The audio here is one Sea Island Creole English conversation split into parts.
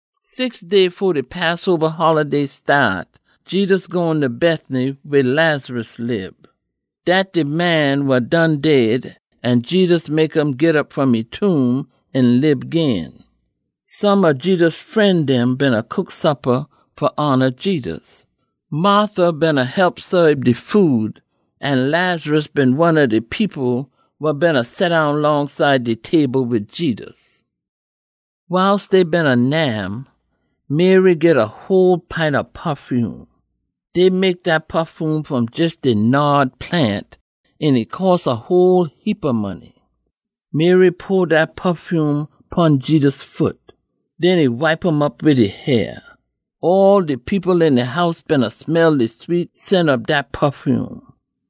Six day fo de Passoba holiday staat, Jedus gone ta Bethany, weh Lazarus lib. Dat de man wa done dead an Jedus mek um git op fom e tomb, an lib gin. Some ob Jedus fren dem beena cook suppa fa hona Jedus. Martha beena hep fa saab de food, an Lazarus one ob de people wa beena seddown longside de table wid Jedus. Wiles dey beena nyam, Mary git a whole pint ob pafume. Dey mek dat pafume fom jes de nard plant, an e cost a whole heapa money. Mary pour dat pafume pon Jedus foot. Den e wipe um op wid e hair. All de people een de house beena smell de sweet scent ob dat pafume.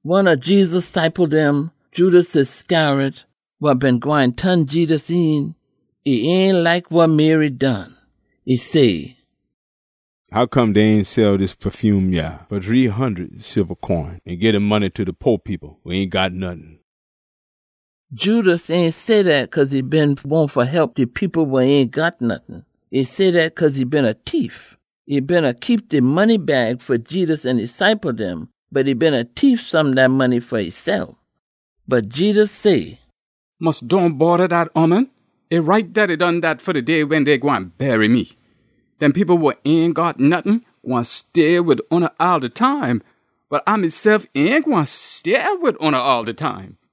One ob Jedus ciple dem, Judas Iscariot wa been gwine ton Jedus een, e ain like wa Mary done. E say, “Hoccome dey ain sell dis pafume yah fa shree hundud silba coin, an gii de money ta de po people wa ain got nottin?” Judas ain say dat cause e been wahn fa hep de people wa ain got nottin. E say dat cause e been a tief. E beena keep de money bag fa Jedus an e ciple dem, bot e beena tief some dat money fa esef. Bot Jedus say, “Mus dohn bodda dat ooman! E right dat e done dat fa de day wen dey gwine bury me. Dem people wa ain got nottin gwine stay wid oona all de time, bot A mesef ain gwine stay wid oona all de time.”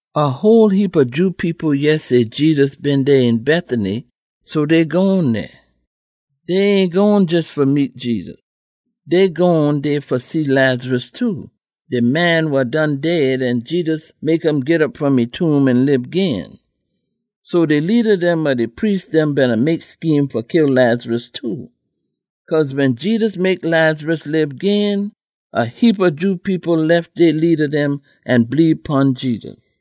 A whole heapa Jew people yeh say Jedus been dey een Bethany, so dey gone dey. Dey ain gone jes fa meet Jedus. Dey gone dey fa see Lazarus too, de man wa done dead an Jedus mek um git op fom e tomb an lib gin. So de leada dem ob de priest dem beena mek scheme fa kill Lazarus too. Cause wen Jedus mek Lazarus lib gin, a heapa Jew people lef dey leada dem an bleebe pon Jedus.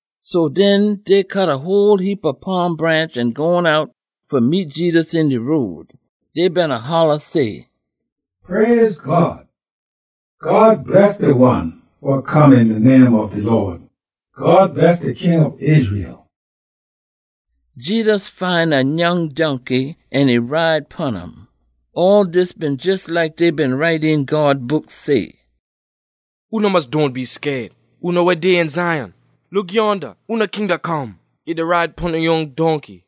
So den, dey cut a whole heapa palm branch an gone out fa meet Jedus een de road. Dey beena holla say, “Praise God! God bless de one wa come een de name ob de Lawd! God bless de King ob Israel!” Jedus find a nyoung donkey, an e ride pon um. All dis been jes like dey been write een God Book say, “Oona mus dohn be scaid, oona wa dey een Zion! Look yonda! Oona king da come, e da ride pon a nyoung donkey.”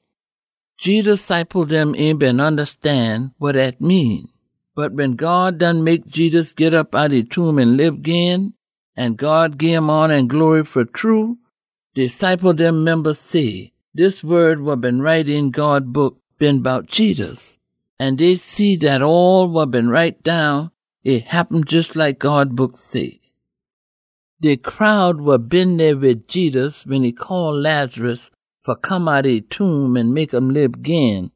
Jedus ciple dem ain been ondastan wa dat mean. Bot wen God done mek Jedus git op outta e tomb an lib gin, an God gim hona an glory fa true, de ciple dem memba say, dis wod wa been write een God Book been bout Jedus. An dey see dat all wa been write down, e happen jes like God Book say. De crowd wa been dey wid Jedus wen e call Lazarus fa come outta e tomb an mek um lib gin,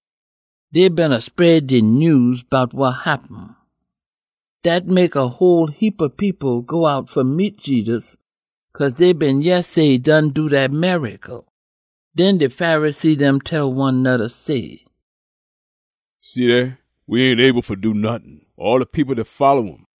dey beena spread de nyews bout wa happen. Dat mek a whole heapa people go out fa meet Jedus, cause dey been yeh say e done do dat miracle. Den de Pharisee dem tell one noda say, “See dey, we ain able fa do nottin! All de people da folla um!”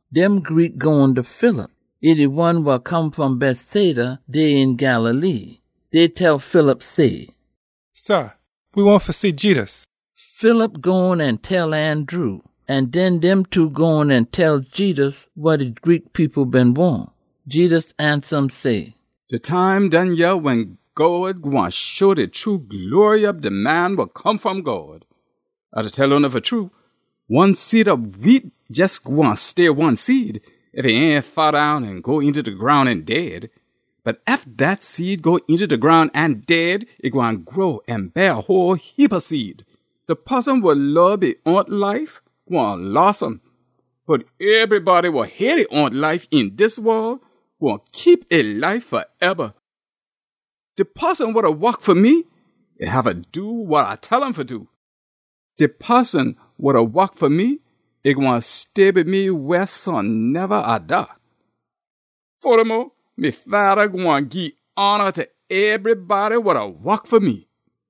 Dem Greek gone ta Philip. E de one wa come fom Bethsaida, dey een Galilee. Dey tell Philip say, “Sah, we wahn fa see Jedus.” Philip gone an tell Andrew, an den dem two gone an tell Jedus wa de Greek people been wahn. Jedus ansa um say, “De time done yah wen God gwine show de true glory ob de Man wa Come fom God. A da tell oona fa true, one seed ob wheat jes gwine stay one seed, ef e ain faddown an go eenta de groun an dead. Bot ef dat seed go eenta de groun an dead, e gwine grow an beah a whole heapa seed. De poson wa lob e own life gwine loss um, bot ebrybody wa hate e own life een dis wol gwine keep e life faeba. De poson wa da wok fa me, e haffa do wa A tell um fa do. De poson wa da wok fa me, e gwine stay wid me wehsoneba A da. Fodamo, me Fada gwine gii hona ta ebrybody wa da wok fa me.”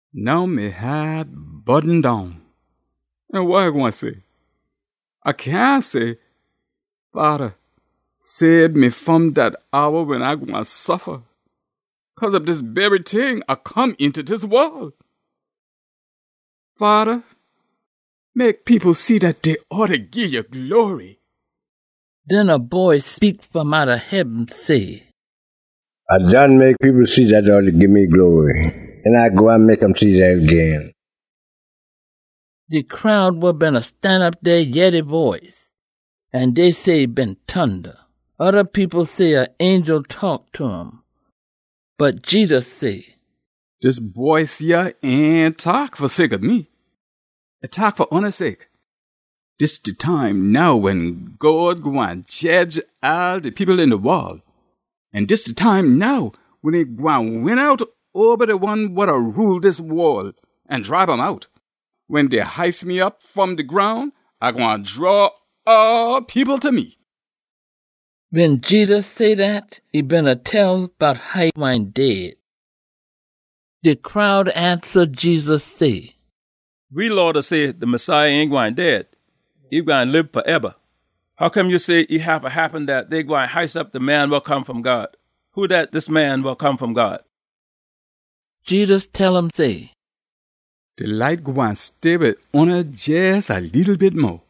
“Now me haat burden down, an wa A gwine say? A cyahn say, ‘Fada, sabe me fom dat hour wen A gwine suffa.’ Cause ob dis bery ting, A come eenta dis wol. Fada, mek people see dat dey oughta gii ya glory!” Den a boice speak fom outta heaben say, “A done mek people see dat dey oughta gii me glory, an A gwine mek um see dat gin.” De crowd wa beena stanop dey yeh de boice, an dey say e been tunda. Oda people say a angel taak ta um. Bot Jedus say, “Dis boice yah ain taak fa sake ob me. E taak fa oona sake. Dis de time now wen God gwine jedge all de people een de wol. An dis de time now wen e gwine win out oba de one wa da rule dis wol, an dribe um out. Wen dey hice me op fom de groun, A gwine draw all people ta me.” Wen Jedus say dat, e beena tell bout how e gwine dead. De crowd ansa Jedus say, “We Law da say de Messiah ain gwine dead. E gwine lib faeba. Hoccome ya say e haffa happen dat dey gwine hice op de Man wa Come fom God? Who dat dis Man wa Come fom God?” Jedus tell um say, “De light gwine stay wid oona jes a leetle bit mo.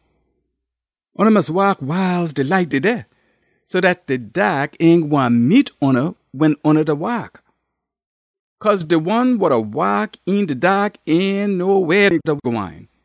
Oona mus waak wiles de light dey dey, so dat de daak ain gwine meet oona wen oona da waak. Cause de one wa da waak een de daak ain know weh e da gwine.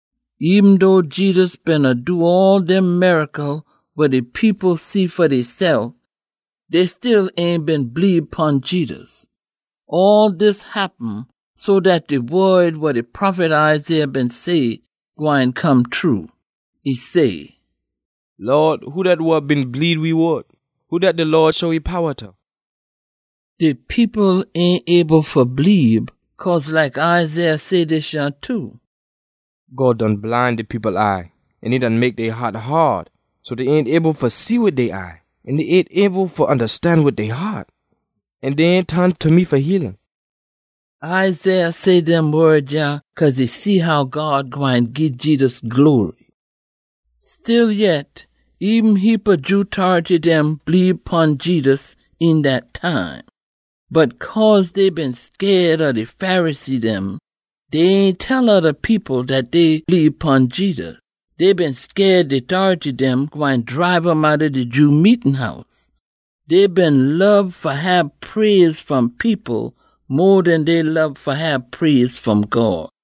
Eben dough Jedus beena do all dem miracle wa de people see fa deysef, dey still ain been bleebe pon Jedus. All dis happen so dat de wod wa de prophet Isaiah been say, gwine come true. E say, “Lawd, who dat wa been bleebe we wod? Who dat de Lawd show e powa ta?” De people ain able fa bleebe, cause like Isaiah say dis yah too, “God done bline de people eye, an e done mek dey haat haad, so dat dey ain able fa see wid dey eye, an dey ain able fa ondastan wid dey haat, an dey ain ton ta me fa heal um.” Isaiah say dem wod yah cause e see how God gwine gii Jedus glory. Stillyet, eben heapa Jew tority dem bleebe pon Jedus een dat time. Bot cause dey been scaid ob de Pharisee dem, dey ain tell oda people dat dey bleebe pon Jedus. Dey been scaid de tority dem gwine dribe um outta de Jew meetin house. Dey been lob fa hab praise fom people mo den dey lob fa hab praise fom God.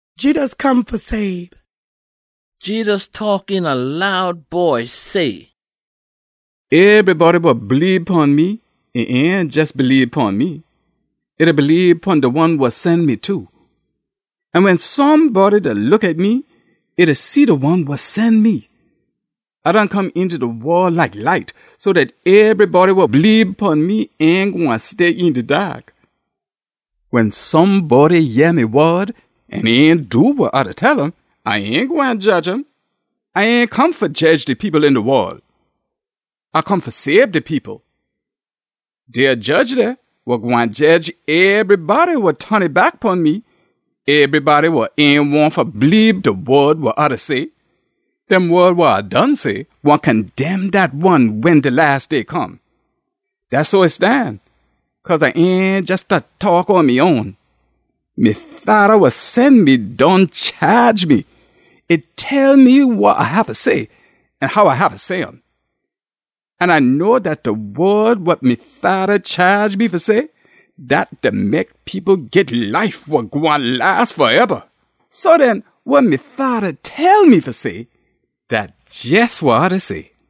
Jedus taak een a loud boice say, “Ebrybody wa bleebe pon me, e ain jes bleebe pon me. E da bleebe pon de one wa sen me too. An wen somebody da look at me, e da see de one wa sen me. A done come eenta de wol like light, so dat ebrybody wa bleebe pon me ain gwine stay een de daak. Wen somebody yeh me wod an ain do wa A da tell um, A ain gwine jedge um. A ain come fa jedge de people een de wol. A come fa sabe de people. Dey a jedge dey wa gwine jedge ebrybody wa ton e back pon me, ebrybody wa ain wahn fa bleebe de wod wa A da say. Dem wod wa A done say gwine condemn dat one wen de las day come! Dat so e stan, cause A ain jes da taak on me own. Me Fada wa sen me done chaage me, e tell me wa A haffa say an how A haffa say um. An A know dat de wod wa me Fada chaage me fa say, dat da mek people git life wa gwine las faeba. So den, wa me Fada tell me fa say, dat jes wa A da say.”